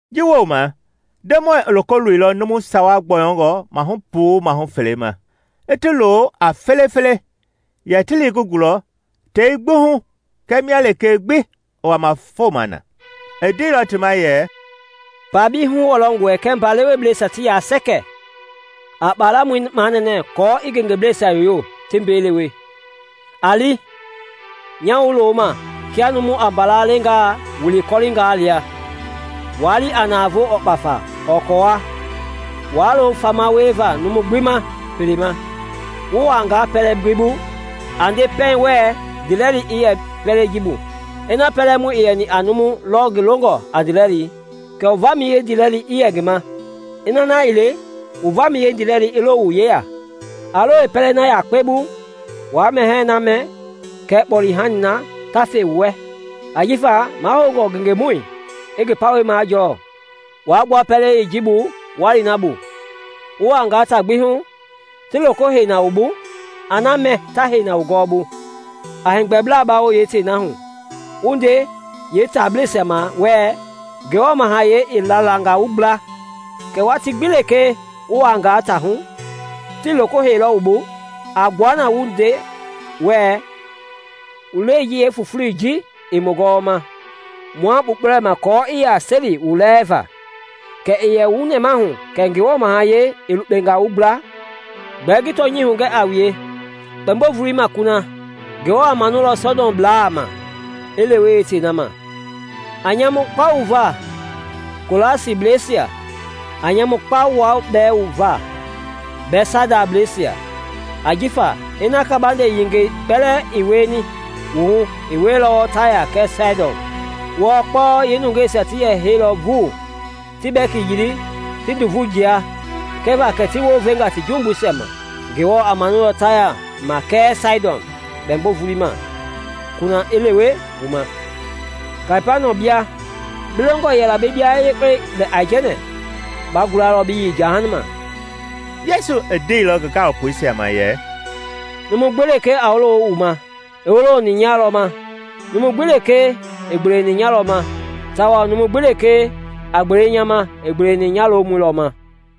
Ji wooma Ndemɔi i loko loilɔ numu sawa gbɔyɔngɔ mahu puu mahu fele ma, i ti lo a fele-fele yɛ ti li ngi gulɔ tei gbi hu kɛɛ mia lekee gbi i wama foma na. I ndeilɔ ti ma yɛ, “Mba-bei huwɔlɔngɔe kɛɛ mba lewebleisia ti ya sɛkɛ. A kpalamɔi manɛnɛ aako i ngengeblaa yoyo ti ngi bei lewe, ti mbeelɛ. A li! Nya wu loma kia numu a mbala leengaa wili kɔlinga lia. Waa li a navoo ɔɔ kpafa ɔɔ kɔɔwa; waa lo fama wieva numu gbi ma pelei ma. Wu wuangaa pɛlɛ gbi bu, a nde pɛiŋ wɛ, ‘Ndiilɛli i yɛ pɛlei ji bu.’ Ina pɛlɛmɔi i yɛni a numu lɔ ngi longɔ a ndiilɛli, kɛ wu vamɛi yeendilɛlii i yɛ ngi ma; ina na ii le, wu vamɛi yeendilɛlii i lo wu yeya. A lo yeepɛlei na yakpe bu, wa mɛhɛɛ na mɛ kɛɛ kpɔle-hani na ta fe wu wɛ, ajifa mahoungɔ ngengemɔi i ngi pawɛi majɔɔ. Waa lewe-tewenga, wa gbua pɛlei yee ji bu wa li na bu. Wu wuanga taa gbi hu, ti loko hei na wu bu, a na mɛ ta hei wu gɔwɔbu, a heegbɛbla bawo yeetei na hu, wu nde yeetaablɛisia ma wɛɛ, ‘Ngewɔ Mahayɛi i lalanga wu gbla.’ Kɛɛ watii gbi lekee wu wuangaa taa hu, tii loko heillɔ wu bu, a gbua na wu nde wɛɛ, ‘Wu lɛi ji yeefufulei ji i mu gɔwɔma, mua kpukpulɛma aako i yɛ a seli wu lɛɛva. Kɛɛ i yɛ wu nɛmahu kɛ Ngewɔ Mahayɛi i lukpenga wu gbla!’ Gbɛɛ ngi tɔnyɛi hugɛ a wue, kpɛmbo-volei ma kuna, Ngewɔ a manulɔ Sɔdɔmblaa ma i lewe yeetei na ma! “A nyamu kpa wu va, Kolasibleisia! A nyamu kpa wua bɛɛ va Bɛtsaidablɛisia! Ajifa ina kabande yengei kpɛlɛɛ i wieni wu hu i wieilɔ Taya kɛɛ Saidɔn, wɔɔ kpɔlɔ yeenungeisia ti yɛ heilɔ vuu, ti bɛki yili ti nduvui jia, kɛva kɛ ti wounvenga ti jumbuisia ma! Ngewɔ a manulɔ Taya ma kɛɛ Saidɔn kpɛmbo-volei ma kuna i lewe wu ma. Kapaniɔm bia! Bi longɔ yɛla bi bia yekpe lɛ aijɛnɛ? Ba gulalɔ bi yei jahama!” Yesu i ndeilɔ ngi gaalopoisia ma yɛ, “Numu gbi lekee a wolo wu ma, i wooloni nya lɔ ma; numu gbi lekee a gbele wu ma, i gbeleni nya lɔ ma; tawao numu gbi lekee a gbele nya ma, i gbeleni nya lomɔi lɔ ma.”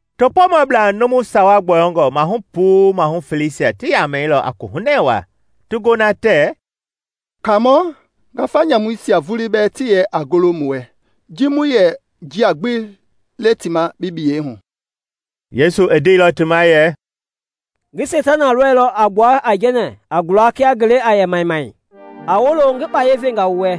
Topoomabla numu sawa gbɔyɔngɔ mahu puu mahu feleisia ti yamɛilɔ a kohunɛ wa ti gona tɛɛ, “Kaamɔ, ngafa nyamuisia vulii bɛɛ ti yɛlɔ a golo mu wɛ ji mu yɛ njia gbi le ti ma bi biyei hu!” Yesu i ndeilɔ ti ma yɛ, “Ngi Seitana lɔilɔ i gbua aijɛnɛ i gula kia ngelei a yɛ miamia! A wolo! Ngi kpaya venga wu wɛ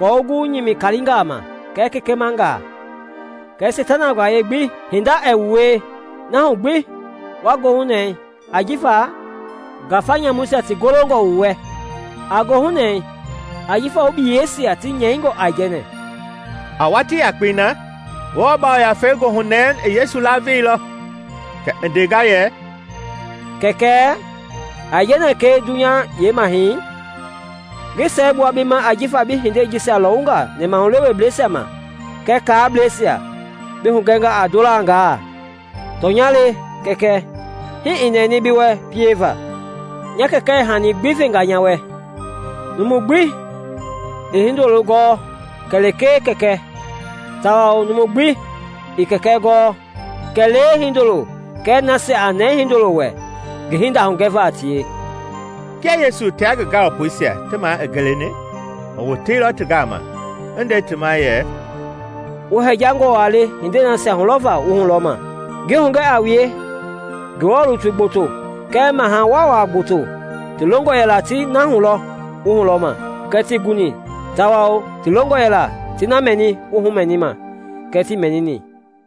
aako wu gu a nyimila kalingaa ma kɛɛ kekemanga kɛɛ Seitana gbayei gbi, hinda ɛɛ wu wie. Na hu gbi waa goohunɛɛ ajifa ngafa nyamuisia ti golongɔ wu wɛ, a goohunɛɛ ajifa wu biyeisia ti nyɛingɔ aijɛnɛ.” A watii yakpei na, Ngewɔ Yafei goohunɛɛi i Yesu laveilɔ kɛ i ndenga yɛ, “Kɛkɛ, aijɛnɛ kɛɛ dunya yeemahɛi, ngi siɛgbua bi ma ajifa bi hindei jisia lɔwunga nɛmahuleweblɛisia ma kɛɛ kaableisia bi hugɛnga a ndolangaa. Tɔnya le, Kɛkɛ, hii i nɛni bi wɛ pieva. “Nya Kɛkɛ i hani gbi venga nya wɛ. Numu gbi ii Hindoloi gɔɔ kɛlee Kɛkɛi tawao numu gbi ii Kɛkɛi gɔɔ kɛlee Hindoloi kɛɛ nasia a nɛɛ Hindoloi wɛ ngi hinda hugɛva a tie.” Kia Yesu tia ngi gaalopoisia ti ma i geleni, i woteilɔ ti gama i nde ti ma yɛ, “Wu hɛjangɔ wa le hindei nasia hulɔvaa wu hulɔma. Ngi hugɛ a wue, Ngewɔ lutui gboto kɛɛ maha waawaa gboto ti longɔ yɛla ti na hulɔ wu hulɔma kɛɛ tii guni tawao ti longɔ yɛla ti na mɛni wu humɛnima kɛɛ tii mɛnini.”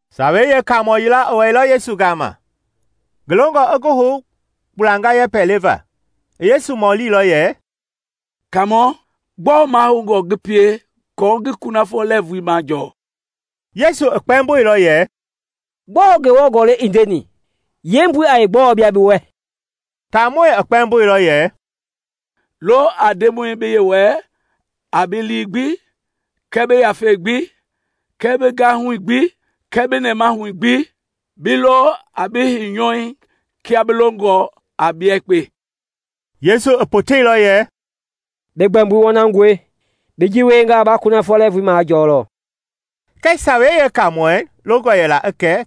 Sawei Yeekaamɔ yila i wɛilɔ Yesu gama ngi longɔ i ngi hou kpulanga yɛpɛ leva. I Yesu mɔlilɔ yɛ, “Kaamɔ, gbɔɔ mahoungɔ ngi pie aako ngi kunafɔ lɛɛvui majɔɔ?” Yesu i kpɛmboilɔ yɛ, “Gbɔɔ Ngewɔ Gɔlɛi i ndeni? Yeembui a gbɔɔ bia bi wɛ?” Taamɔi i kpɛmboilɔ yɛ, “Lo a Ndemɔi bi Yewɔɛi a bi lii gbi kɛɛ bi yafei gbi kɛɛ bi gahui gbi kɛɛ bi nɛmahui gbi, bi lo a bi heinyɔui kia bi longɔ a bia yekpe.” Yesu i poteilɔ yɛ, “Bi gbɛmboi wɔnangɔe, bi ji wienga ba kunafɔ lɛɛvui majɔlɔ.” Kɛɛ Sawei Yeekaamɔi longɔ yɛla i kɛ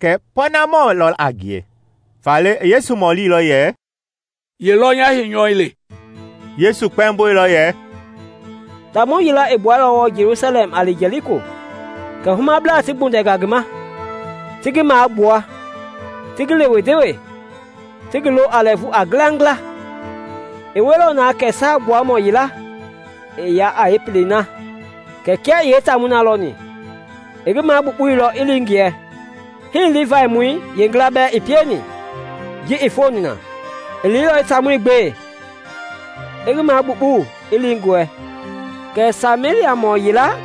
kɛ pɔɔnamɔ lɔ a ngie, faale i Yesu mɔlilɔ yɛ, “Ye lɔ nya heinyɔui le?” Yesu kpɛmboilɔ yɛ, “Taamɔ yila i gbuɛilɔ wɔɔ Jelusalɛm a li Jɛliko, kɛ humablaa ti gbundɛnga ngi ma, ti ngi magbua, ti ngi lewe-ndewe, ti ngi lo a lɛɛvu a ngilangila. I wieilɔ na kɛ Saa Gbuamɔ yila i ya a yeepelei na; kɛɛ kia i taamɔi lɔni, i ngi magbukpuilɔ i li ngiɛ. Hii Livaimɔ yila bɛɛ i pieni ji i foni na. I liilɔ i taamɔi gbe, i ngi magbukpuu, i li ngiɛ. Kɛɛ Sameliamɔ yila,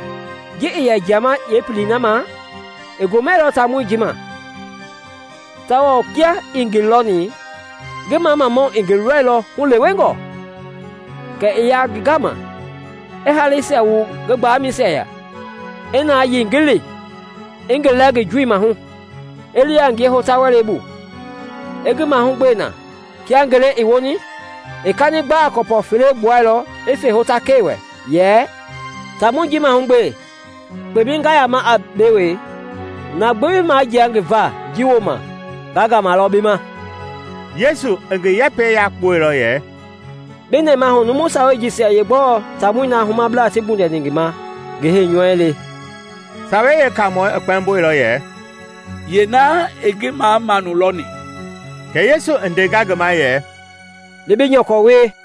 ji i yɛ jiama a pelei na, i gomɛilɔ taamɔi ji ma, tawao kia i ngi lɔni, ngi mamamau i ngi lɔilɔ hulewengɔ. Kɛ i ya ngi gama, i haleisia wu ngi gbalɛmɛisia, i na yilingili, i ngi lɛ ngi joi mahu, i li a ngie hota-wɛlei bu, a ngi mahugbe na. Kia ngele i woni, i kani gbaa gɔpɔ fele gbuɛilɔ i fe hotakɛi wɛ yɛ, ‘Taamɔi ji mahugbe; kpemɛi nga yama a mbei wee, na gbi ba majia ngi va ji wooma, nga ngama lɔ bi ma.’” Yesu i ngi yɛpɛi yakpuɛilɔ yɛ, “Bi nɛmahu numu sawei jisia yeegbɔɔ taamɔi na humabla ti gbundɛni ngi ma ngi heinyɔu le?” Sawei Yeekaamɔi i kpɛmboilɔ ye; “Yeena i ngi mamamau lɔni.” Kɛ Yesu I ndenga ngi ma yɛ, “Li bi nyɔkɔ wie.”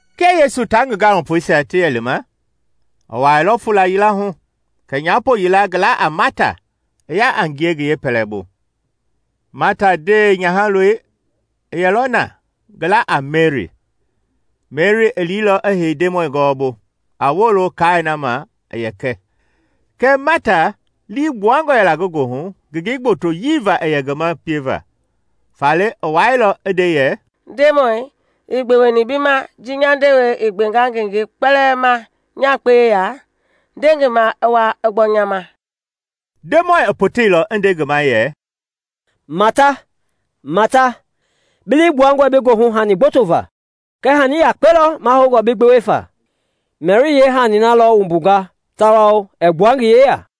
Kia Yesu tia ngi gaalopoisia ti yɛli ma, i wuailɔ fuula yila hu kɛ nyapo yila ngi la a Mata, i ya a ngie ngi yeepɛlɛbu. Mata ndewenyahaloi i yɛlɔ na ngi la a Meri. Meri i liilɔ i hei Ndemɔi gɔwɔbu a wolo kaai na ma i yɛ kɛ. Kɛɛ Mata lii gbuangɔ yɛla ngi goohu ngengei gbotoyii va i yɛ ngi ma pieva, faale i wɛilɔ i nde yɛ, “Ndemɔi, ii gbeweni bi ma ji nya ndewei i gbenga ngengei kpɛlɛɛ ma nya yakpe yeya? Nde ngi ma i wa i gbɔ nya ma!” Ndemɔi i poteilɔ i nde ngi ma yɛ, “Mata, Mata! Bi lii gbuangɔe bi goohu hani gboto va, kɛɛ hani yakpe lɔ mahoungɔ bi gbewe fa. Meri i yeehani lɔ wumbunga tawao ɛɛ gbua ngi yeya.”